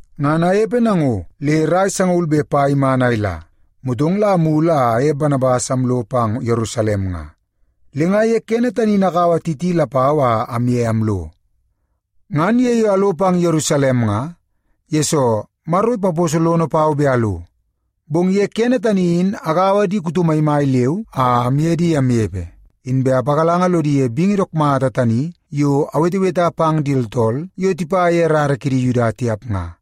Ngan anepe nango le rai sangaul be pai iman a ila, motong la amulu a aye Banabas amlo pang Yerusalem nga. Le nga ye kene tani in akaua Titi lapau a amye amlo. Ngan ye yo alo pang Yerusalem nga, yesoo Maro ipaposo lono pau bet alo. Bong ye kene tani in agaua di kuto maimai leu a amye di amnepe, inbe apagalanga lodi ye bingi dook mata tani yo aweteweta pang di tooltool yo tipa ye rara kidi Yuda tiap nga.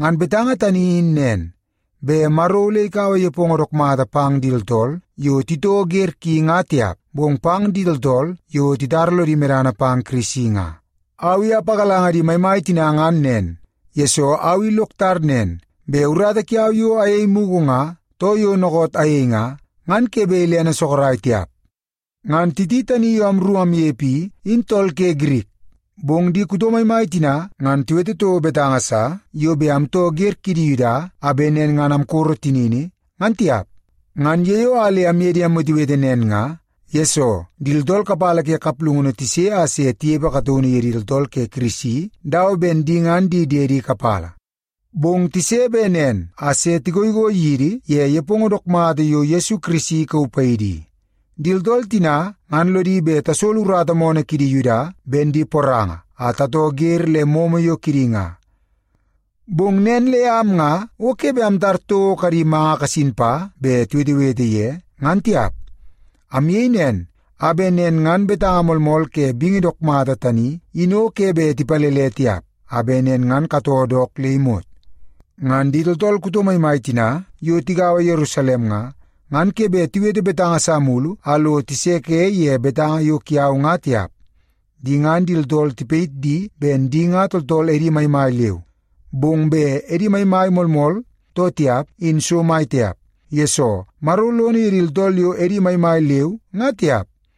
Ngan betanga tani in nen, bet Maro ole ikaua nepongo dook mata pang di tooltool yo titoo wer ki nga tiap, bong pang di tooltool yo titara lodi medana pang Kirisi nga. Au i apagalanga di maimai tina ngan nen, yesoo au i lok tar nen, bet urata kiau yo ayei mugu nga, too yo dookoot ayei nga, ngan o ke bet ilene sorok tiap. Ngan Titi tani yo amru amnepe i, in tool ke Girik. Bong di kuto maimai tina ngan tiwete toko betanga sa yo bet amtoo wer kidi Yuda a bet nen ngan amkoro tinini, ngan tiap. Ngan ye yo a le amye di amwetewete nen nga, yesoo di tooltool kapala ke kaplungunu tise a se tinepe kataunu yidi tooltool ke Kirisi dawa ben di ngan di diede kapala. Bong tise bet nen a se tigoigoi yidi ye nepongo dook mata yo Yesu Kirisi ikauu paidi i. Di tooltool tina ngan lodi bet tasolo urata moonoo kidi Yuda ben di poranga a tatoo wer le momo yo kidi nga. Bong nen le am nga o ke bet amtar toko kadi manga kasin pa bet tiwetewete ye, ngan tiap. Amyei nen a bet nen ngan betanga moolmool ke bingi dook mata tani in o ke bet tipalele tiap, a bet nen ngan katoo dook le imot. Ngan di tooltool kuto maimai tina yo tigaua Yerusalem nga, ngan ke bet tiwete betanga sa mulu a lo tiseke ye betanga yo kiau nga tiap. Di ngan di tooltool tipayit di ben di ngan tooltool edi maimai leu. Bong bet edi maimai moolmool too tiap in so mai tiap, yesoo Maro lono ye di tooltool yo edi maimai leu nga tiap.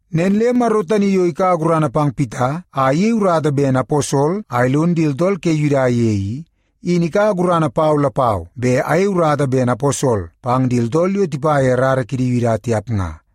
Nen le Maro tani yo ikaua gurana pang Pita a iyei urata ben aposol a ilon di tooltool ke Yuda i, in ikaua gurana pau lapau bet ayei urata ben aposol pang di tooltool yo tipa ye rara kidi Yuda tiap nga.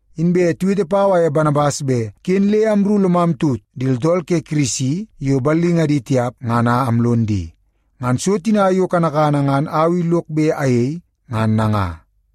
Inbe tiwete pau aye Banabas bet ken le amru lomam tut di tooltool ke Kirisi yo ballingadi tiap ngan a amlon di. Ngan so tina yo kanakana ngan au i lok bet ayei ngan nanga.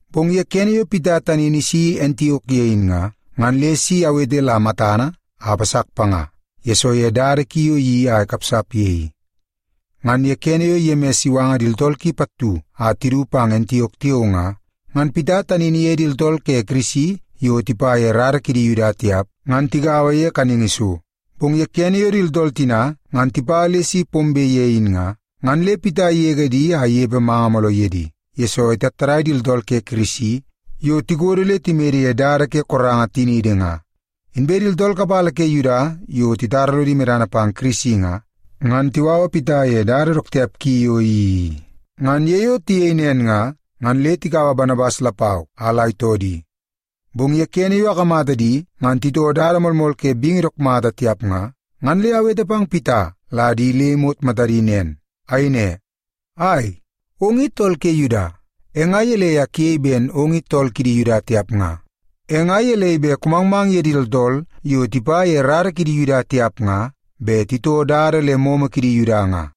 Bong ye kene yo Pita tani in isi Antiok ye in nga, ngan le si awete la matana a apasak panga, yesoo ye dada ki yo iyeii a ikapsap ye i. Ngan ye kene yo Yemis iwanga di tooltool ki pattu a tidu pang Antiok tiao nga, ngan Pita tani in iye di tooltool ke Kirisi yo tipa ye rara kidi Yuda tiap ngan tigaua ye kaningi so. Bong ye kene yo di tooltool tina ngan tipa le si pombe ye in nga, ngan le Pita igege di a inepe manga mooloo ye di, yesoo itattadai di tooltool ke Kirisi yo tikodo le timede ye dada ke koranga tiniidi nga. Inbe di tooltool kapala ke Yuda yo titara lodi medana pang Kirisi nga, ngan tiwawa Pita ye dada dook tiap ki yo iyeii i. Ngan ye yo tiyei nen nga, ngan le tikaua Banabas lapau a la itoo di. Bong ye kene yo akamata di ngan titoo dada moolmool ke bingi dook mata tiap nga, ngan le awete pang Pita la di le imot matadi nen. Ayei ne, “Ai, ong i tool ke Yuda! E nga gelei a kuyei ben ong i tool kidi Yuda tiap nga? E nga gelei bet kumangmang ye di tooltool yo tipa ye rara kidi Yuda tiap nga bet titoo dada le momo kidi Yuda nga?”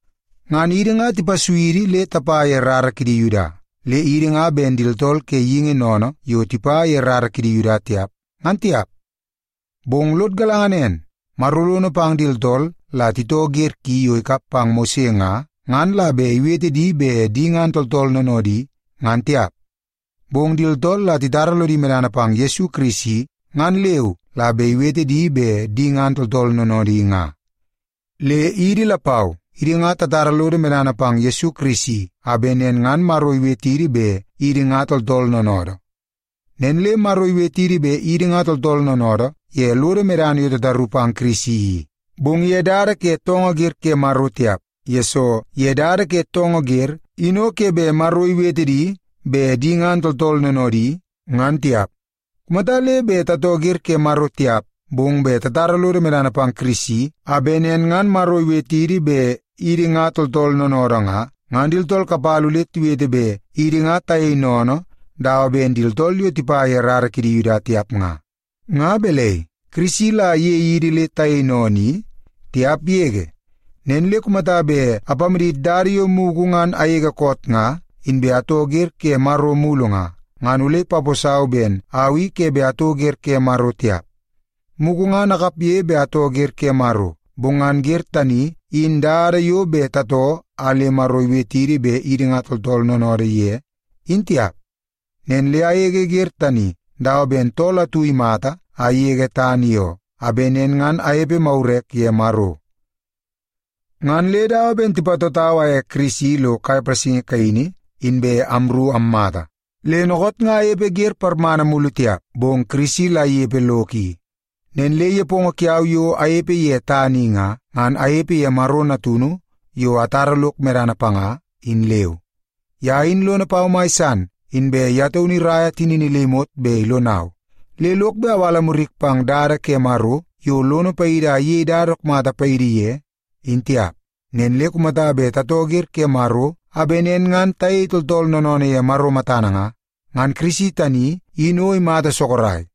Ngan idi nga tipasui idi le tapa ye rara kidi Yuda, le idi nga ben di tooltool ke geingi sennene yo tipa ye rara kidi Yuda tiap, ngan tiap. Bong lod galanga nen, Maro lono pang di tooltool la titoo wer ki yo ikap pang Mose nga, ngan la bet iwete di bet di ngan tooltool noonoodi, ngan tiap. Bong di tooltool la titara lodi medana pang Yesu Kirisi ngan leu la bet iwete di bet di ngan tooltool noonoodi nga. Le idi lapau, idi nga tatara lodo medana pang Yesu Kirisi a bet nen ngan Maro iwetidi bet idi nga tooltool noonoodoo. Nen le Maro iwetidi bet idi nga tooltool noonoodoo ye lodo medana yo tataru pang Kirisi i, bong ye dada ke toongoo wer ke Maro tiap, yesoo ye dada ke toongoo wer in o ke bet Maro iwete di bet di ngan tooltool noonoodi, ngan tiap. Kumata le bet tatoo wer ke Maro tiap, bong bet tatara lodo medana pang Kirisi a bet nen ngan Maro ikamatidi ben idi nga tooltool noonoodoo nga, ngan di tooltool kapala ole tiwete bet idi nga tayei sennene dawa ben di tooltool yo tipa ye rara kidi Yuda tiap nga. Nga balai, Kirisi la iyei idi le tayei sennene i? Tiap yege! Nen le kumata bet apamadit dada yo mugu ngan agege koot nga inbe atoo wer ke Maro mulu nga, ngan ole ipaposau ben au i ke bet atoo wer ke Maro tiap. Mugu ngan akapge bet atoo wer ke Maro, bong ngan wer tani in dada yo bet tatoo a le Maro iwetidi bet idi nga tooltool noonoodoo ye, in tiap. Nen le agege wer tani dawa ben tool atu imata a igege tana i oo, a bet nen ngan anepe magurek ye Maro. Ngan le dawa ben tipatotau aye Kirisi lo kai palasingi kaini, inbe amru ammata. Le dookoot nga anepe wer parmana mulu tiap, bong Kirisi la inepe lok i. Nen le nepongo kiau yo anepe ye tana i nga, ngan anepe ye Maro Natunu yo atara lok medana panga, in leu. Ye in lono pau mai san, inbe ye taunu iraia tinini le imot bet ilonau. Le lok bet awala murik pang dada ke Maro yo lono paidi a iyei dada dook mata paidi ye, in tiap. Nen le kumata bet tatoo wer ke Maro a bet nen ngan tayei tooltool noonoonoo ye Maro matana nga, ngan Kirisi tani in o imata sorok.